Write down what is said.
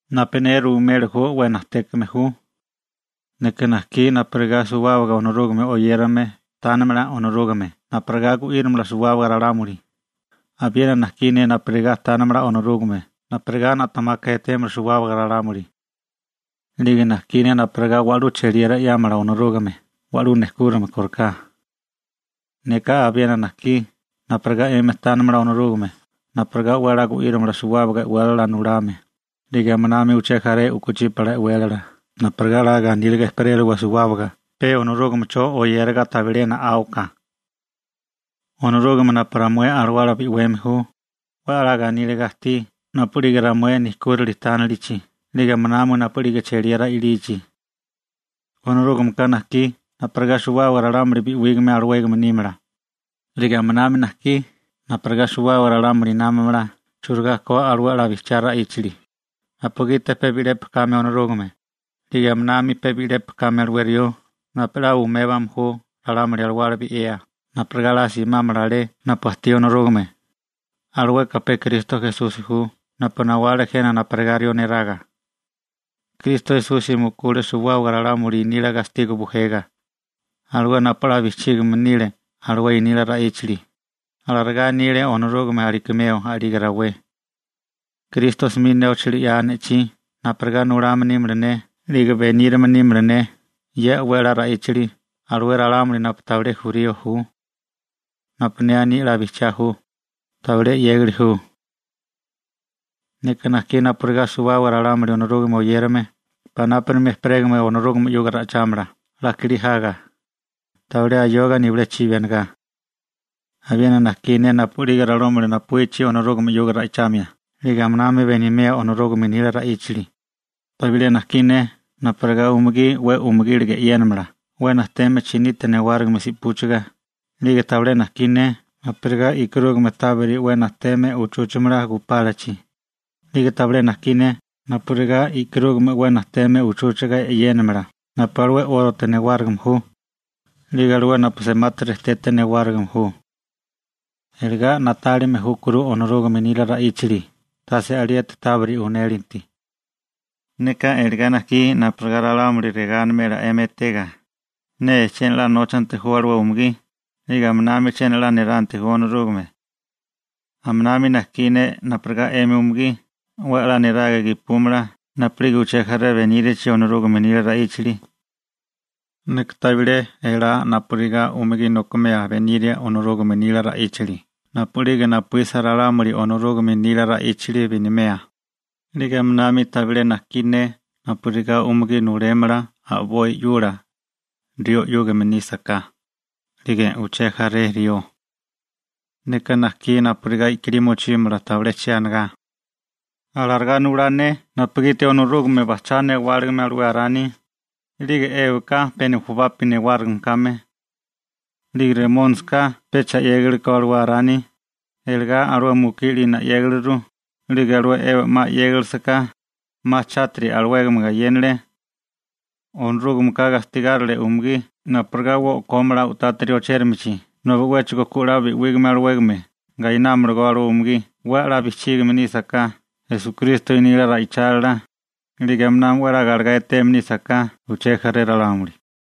Napu ne ruimeli ju 'we najtékame ju. Neka najkí napurigá suwábaga Onorúgame oyérame tánimala Onorúgame napurigá gu'írimala suwábaga ralámuli, abiena najkí ne napurigá tánimala Onorúgame napurigá na'temaka etémala suwábaga ralámuli. 'Lige najkí ne napurigá wa'lú cheliera 'yámala Onorúgame wa'lú nejkúrame kóriká. Neka abiena najkí napurigá 'emi tánimala Onorúgame napurigá 'we 'la gu'írimala suwábaga e'wélala nulame, 'lige aminami uché jaré u'kuchípala e'wélala napurigá 'la ganíliga ejperéliwa suwábaga pe Onorúgamecho oyériga tabilé na'áwaka. Onorúgame napu ramué alawala bi'weme ju, 'we 'la ganíliga ajtí napu'lige ramué nejkúrili tánilichi 'lige aminami napu'lige cheliera i'lichi. Onorúgameka najkí napurigá suwábaga ralámuli bi'wígame alawégame nímala, 'lige aminami najkí napurigá suwábaga ralámuli námamala churigá ko alué 'la bijchiá ra'íchali, napugiti pe bi'lepi kame Onorúgame, 'lige aminami pe bi'lepi kame alué rió napu 'la umébame ju ralámuli alawala bi'wea napurigá 'la simámala alé napu ajtí Onorúgame, alueka pe Kristo Esusi ju napu nawale jena napurigá rió neraga. Kristo Esusi mukule suwábaga ralámuli nila gastigo bujega, alué napu 'la bijchígame nile alué nila ra'íchali, alarigá anile Onorúgame alakimeo a'lige rawé. Kristo 'smi nóchali 'ya ne'chí napurigá nulame nímala ne 'lige benírame nímala ne ye 'we a'lá ra'íchali alué ralámuli napu tabilé jurío ju. Napu ne aní 'la bijchiá ju, tabilé 'yégali ju. Neka najkí napurigá suwábaga ralámuli Onorúgame oyérame panápurimi ejperégame Onorúgame 'yuga ra'ichámala 'la kilí jaga, tabilé ayoga nibilé chibi anigá. Abiena najkí ne napu'lige ralámuli napuíchi Onorúgame 'yuga ra'ichamia 'lige aminami benimea Onorúgame nila ra'íchali, tabilé najkí ne napurigá umugí 'we umugíliga e'yénamala 'we najteme chinite newárigime si'púchiga, 'lige tabilé najkí ne napurigá e'karúgame tabiri 'we najteme uchúchamala gupálachi, 'lige tabilé najkí ne napurigá e'karúgame 'we najteme uchúchiga e'yénamala napu alué 'órote newárigime ju, 'lige alué napu semati rejtete newárigime ju. Iligá na'tálime júkuru Onorúgame nila ra'íchali tase alieti tábiri unélinti. Neka iligá najkí napurigá ralámuli regá animela 'emi etega: «'Nee chiena 'la nóchanti ju alué umugí, 'lige aminami chiena 'la niranti ju Onorúgame.» Aminami najkí ne napurigá 'emi umugí 'we 'la niraga gepúmala napu'lige uché jaré benírachi Onorúgame nila ra'íchali. Neka tabilé elá napurigá umugí nokimea beniria Onorúgame nila ra'íchali napu'lige napuísa ralámuli Onorúgame nila ra'íchali benimea, 'lige aminami tabilé najkí ne napurigá umugí nulémala a'boi 'yula, rió 'yúgame nísaká, 'lige uché jaré rió. Neka najkí napurigá i'kilí mochímala tabilé che anigá. Alarigá nulá ne napugiti Onorúgame bajchá newáligime alué Arani, 'lige Ébaka pe nujubapi newárigime kame. 'Lige Remónisika pecha 'yégiliko alué Arani, eligá alué mukí 'lina 'yégiliru, 'lige alué Eba 'ma 'yégilisiká, 'ma chátiri alawégame gayénale. Onorúgameka gastigárile umugí napurigá 'we o'kómala u'tátiri ochérimichi nobi 'wéchigo ku 'la bi'wígame alawégame gainámalagó alué umugí 'we 'la bijchígame nísaká Esukristo nila ra'ichálila, 'lige aminami 'we 'la galegá eteme nísaká uché jaré ralámuli.